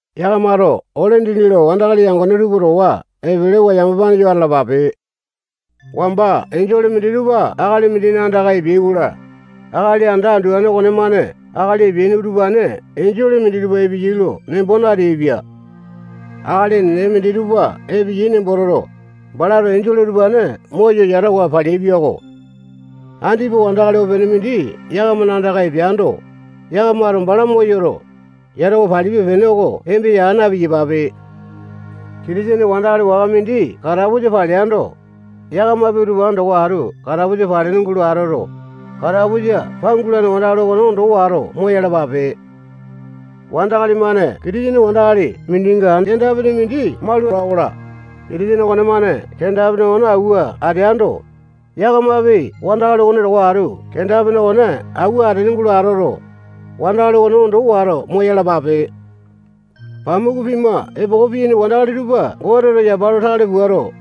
Yakamato ole dindi lo wandakali yangone tupa towa epelewa yamapa yo atalapape. Wamba enjole minditupa akali mindina andaka epeai-kola, akali anda anduane okonemane akali epeaini utupane enjole minditupa epeyai nembo nateainipia. Akali enene minditupa epeyai nembo toto, balato enjole utupane moyo yatawa paleaipia-ko. Andipa wandakali opene mindi yakamana andaka epeando, yakamato bala moyoto, yatawa palipe-pene oko embesa aa na-piyapape. Kitisene wandakali waka mindi katapusa paleando, yakamapi utupane towa atu katapusa palene atoto, katapusa pangulane wandakali okone ondo wato moyalapape. Wandakali-mane Kitisene wandakali mindinga kenda-pene mindi maula-kola, Kitisene okonemane kenda-pene okone awua ateando, yakamapi wandakali okone towa atu kenda-pene okone awua atene atoto, wandakali okone ondo wato moyalapape. Goteto pamuku pima epoko piyaini wandakali tupa yapa lo tale puato,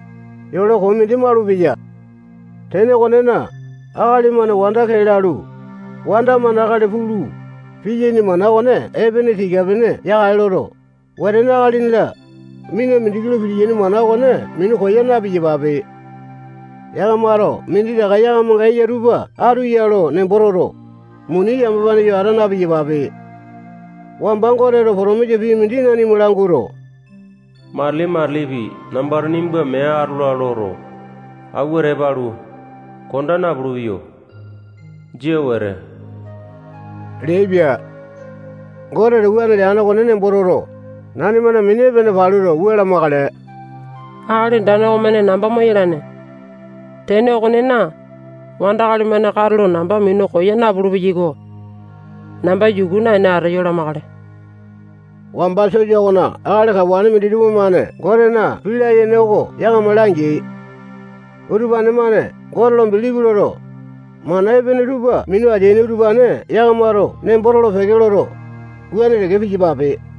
yole koo mindi malupeya. Tene okonena, akali-mane wanda kee lalu, wanda-mane akali pulu, piyaini mana okone epene tika-pene yakale loto, wetene, akalini-la, mina mindiki lo pitiyaini mana okone minu koya na-piyapape. Yakamato minditaka yakamanga eya tupa atu ya lo nembo toto, muni yamapane yo ata na-piyapape. Wamba Goteto potomisa pii mindi nanima languato, matili-matilipi nambato nimba mee atola loto, awua tepa alu, konda napulu-peyo. Jia wete leaipia. Goteto wuane leane okone nembo toto, nanimana mini epene paluto, wua lamakale. Akali Andane okomane namba moyalane. Tene okonena, wandakali-mane katulo namba minu koya napulu-peyai-ko. Namba yuku naene ateyo lamakale. Wamba sosa okona akali kawane minditupa-mane Gotena pii layene oko yakama langeai. Utupane-mane Gote lo bilipi loto, mana epene tupa minu ateaini utupane yakamato nembo tolo-peke loto, wuane teke piyapape.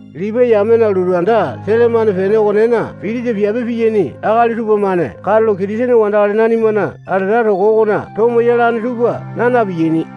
Lipai yamena lotu anda sele-mane pene okonena pitisa piape piyaini akali tupamane katulo Kitisene wandakali nanimana alata toko okona tomo yalane tupa naa na-piyaini.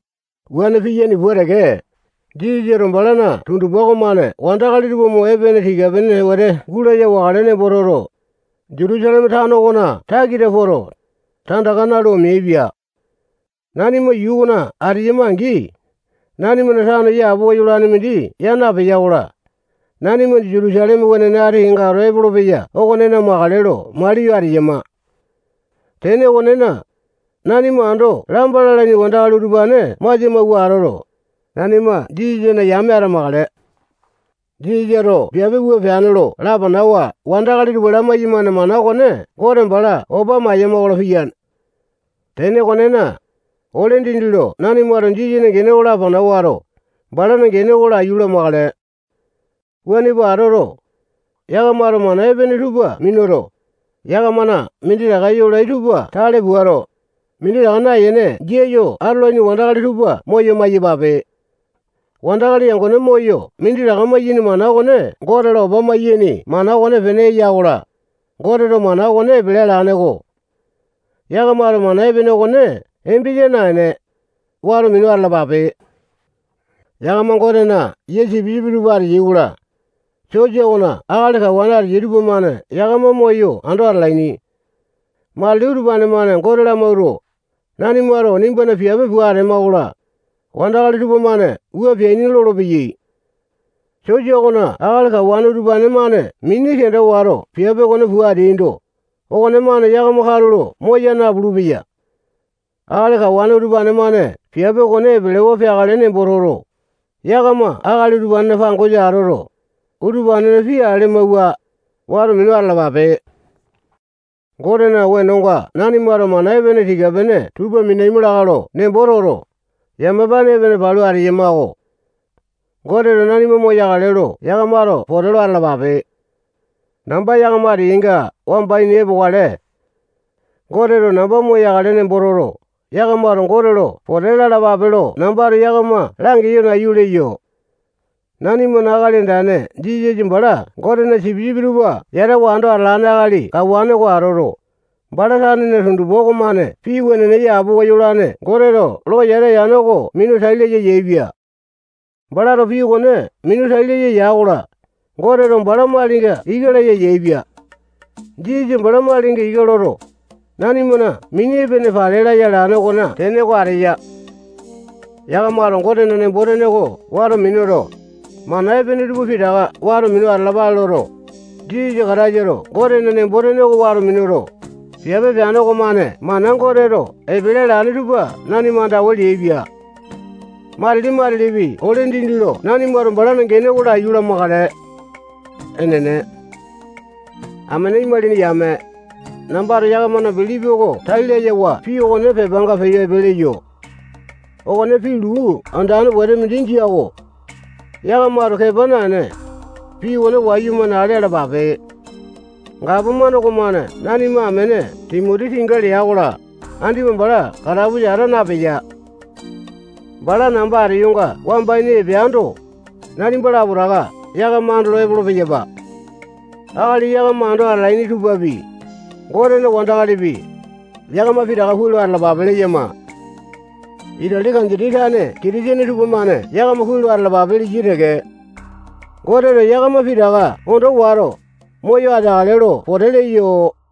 Wuane piyaini pua teke, Jisasato balana tundupa okomane wandakali tupa mo epene tika-pene wete gulaya wakale nembo toto, Jutusaleme tano okona takita poto, tandaka nalu omeainipia. Nanima yuu okona ateyama-angi, nanimana tano yapowa yolane mindi yaa napea-kola, nanima Jutusaleme wenene ati kenga ato epolopeya okonena makale lo maliyo ateyama. Tene okonena, nanima ando lamba lalaini wandakali utupane masia mawua atoto, nanima Jisasana yame atamakale. Jisasato piape wua pua peane lo lapanawa wandakali tupa lamai-yamane mana okone Gote bala opa mayama-kola, piyane. Tene okonena, ole dindi lo nanimato Jisasana gene oko lapana wato, balana gene oko laiyu lamakale. Wuane pua atoto, yakamato mana epene tupa minuto, yakamana minditaka yolai tupa tale puato, minditaka nayene jia yo atolaini wandakali tupa moyo maiyapape. Wandakali yangone moyo minditaka maiyaini mana okone Gote lo opa maiyaini mana okonepene eya-kola, Goteto mana okone epele alane-ko. Yakamato mana epene okone embesa naene, wato minu atalapape. Yakama Gotena yia sipisipi tupa ateyai-kola, sosa okona akali kawane ateyai tupamane yakama moyo ando atalaini. Matili utupane-mane Gote lamawuato, nanimato nimbana piape pua atema-kola, wandakali tupamane wua peaini lolopeyai. Sosa okona akali kawane utupane-mane mini kenda wato piape okone pua ateaindo, okonemane yakama katulo moya napulu-peya. Akali kawane utupane-mane piape okone epelewa peakale nembo toto, yakama akali utupanena pangosa atoto, utupanena pii ale amawua, wato minu atalapape. Gotena wenonga nanimato mana epene tika-pene tupa minaima lakae lo nembo toto, yamapane epene palu ateyama-ko. Goteto nanima moyakale lo yakamato pote lo atalapape. Namba yakama ateyainga wamba ini epokale. Goteto namba moyakale nembo toto, yakamato Gote lo pote lalapape lo nambato yakama langeyo nayu leyo. Nanimana Akali Andane Jisasa bala Gotena sipisipi tupa yatawa ando atalane akali kawane oko atoto, bala tanena tundupa okomane pii wenene yapowa yolane Goteto lo yata yane oko minu tai laya yaepia. Balato pii okone minu tai laya ya-kola, Goteto bala malinga ika laya yaepia. Jisasa bala malinga ika loto, nanimana mini epene pale laya alane okona tene oko ateya. Yakamato Gotena nembo-tene oko wato minuto, mana epene tupa pitaka wato minu atalapale loto, Jisasa Kataisato Gotena nembo-tene oko wato minuto, piape peane okomane mana Goteto epele alane tupa nanima andawa leaipia. Matili-matilipi ole dindi lo nanimato balana gene oko laiyu lamakale. Enene. Amene imalini yame, nambato yakamana bilipi oko tai layawa pii okone pepanga peyo epe leyo. Okone pii luu andane wete mindi jia-ko. Yakamato kepa naene, pii okone wayumane ale alapape. Gapomane okomane nanima amene Timoti tinga lea-kola, andipa bala katapusa ata napeya. Bala namba ateyonga wamba ini epeando, nalipa lapotaka yakama andolo epolo-peyapa. Akali yakama ando atalaini tupapi, Gotena wandakalipi, yakama pitaka kuai lo atalapape leyama. Itali kanditi tane Kitisene tupamane yakama kuai lo atalapape leyai teke. Goteto yakama pitaka ondo wato, moyo ateakale lo pote leyo.